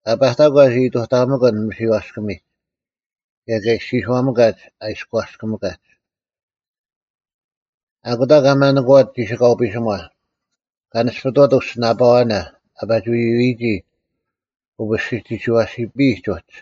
ᐊ ᐸᑕᒂᒡ ᐃᑐᑕᒥᑭᓐ ᒥᓯᐛᔅᑭᒥᑲᒡ, ᑭᔭ ᑲ ᐃᔅᒋᔄᒥᑲᒡ ᐊ ᐃᔎᔅᑭᒥᑲᒡ᙮ ᐊᑯᑕ ᑲᒪᓄᑯᐛᑦ ᒋᓯᑲᐤ ᐱᓯᒺ, ᑲ ᓂᔅᐱᑐᐛᑦ ᐅᔅᒋᓂᐳᐛᓇ ᐊ ᐸᒋ ᐎᐎᔨᒋ ᐅᐱᔅᒋᒋᒋᐛᐱᓯᔨᒡ ᐅᒡ,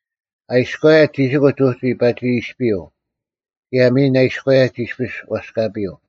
ᐊ ᐃᔎᔭᔨᒡ ᒋᓯᑯᒡ ᐅᒋ ᐸᒋ ᐃᔅᐱᔪᐤ, ᑭᔭ ᒥᓐ ᐊ ᐃᔎᔭᔨᒡ ᐃᔅᐱᔅ ᐛᔅᑲᐱᔪᐤ: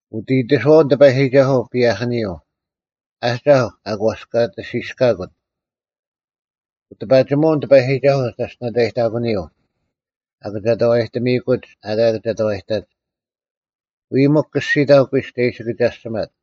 ᐅᑦ ᐃᑎᓱᐛᐅᓐ ᑎᐸᔨᒋᒐᓱᐤ ᐸᔭᐧᑭᓂᔪᐤ, ᐊᒐᐧᒄ ᐊ ᒂᔅᑲᑎᓯᔅᑲᑯᑦ: ᐅᑎᐸᒋᒧᐅᓐ ᑎᐸᔨᒋᒐᓱᐤ ᒐᔅᑎᓇᑕᔭᔨᑕᑯᓂᔪᐤ, ᐊ ᑭᒐᑕᐛᔨᑎᒥᑯᒡ ᐊᑲ ᑭᒐᑕᐛᔨᑕᒡ᙮ ᐎᔾ ᒥᒄ ᑭᔅᒋᑕᐤ ᑯᐃᔅᒄ ᒐ ᐃᓯ ᑭᒐᔅᒋᒪᑦ,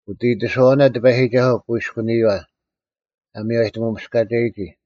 ᐅᑦ ᐃᑎᓱᐛᐅᓇ ᑎᐸᔨᒋᒐᓱᐤ ᑯᐃᔎᓂᔪᐛ, ᐊ ᒥᔽᔨᑎᒧᔅᑲᒐᔨᒋ: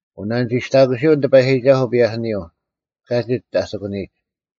ᐅᓇᓂᒋᔅᑕᑯᓯᐅᓐ ᑎᐸᔨᒋᒐᓱᐤ ᐸᔭᐧᑭᓂᔪᐤ, ᑲᒋᒡ ᐊ ᑎᑯᓂᔨᒡ: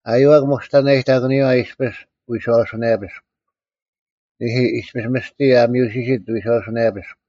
ᐊᔪᐛᒃ ᒧᔅᑕᓇᔨᑕᑯᓂᔪᐛ ᐃᔅᐱᔅ ᐎᔄᐅᓱᓇᔭᐱᔅᒄ, ᓂᐦᐃ, ᐃᔅᐱᔅ ᒥᔅᑎ ᐊ ᒥᔪᓯᓯᑦ ᐎᔄᐅᓱᓇᔭᐱᔅᒄ: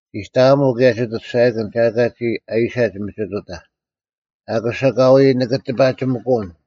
ᒋᑕᐊᒧᐤ ᑭᔭ ᒋᑦ ᐊᑐᔅᒐᔭᑭᓐ ᒐ ᐊᑲ ᒋ ᐊᐃᓴᒡ ᒥᒋᑐᑕᐧᒃ; ᐊᑯᔅ ᐊᑲᐎᔾ ᓂᑭ ᑎᐸᔨᒥᑯᓐ,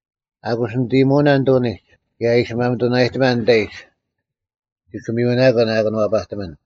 ᐊᑯᔅ ᓂᑦ ᐃᔨᒧᐅᓇ ᓂᑐᓂᒡ, ᑭᔭ ᐊ ᐃᓯ ᒪᒥᑐᓇᔨᑎᒪᓐ ᓂᑕᐃᒡ, ᒋᑭ ᒥᔪᓇᑯᓇ ᐊ ᑭᓄᐛᐸᑎᒥᓐ,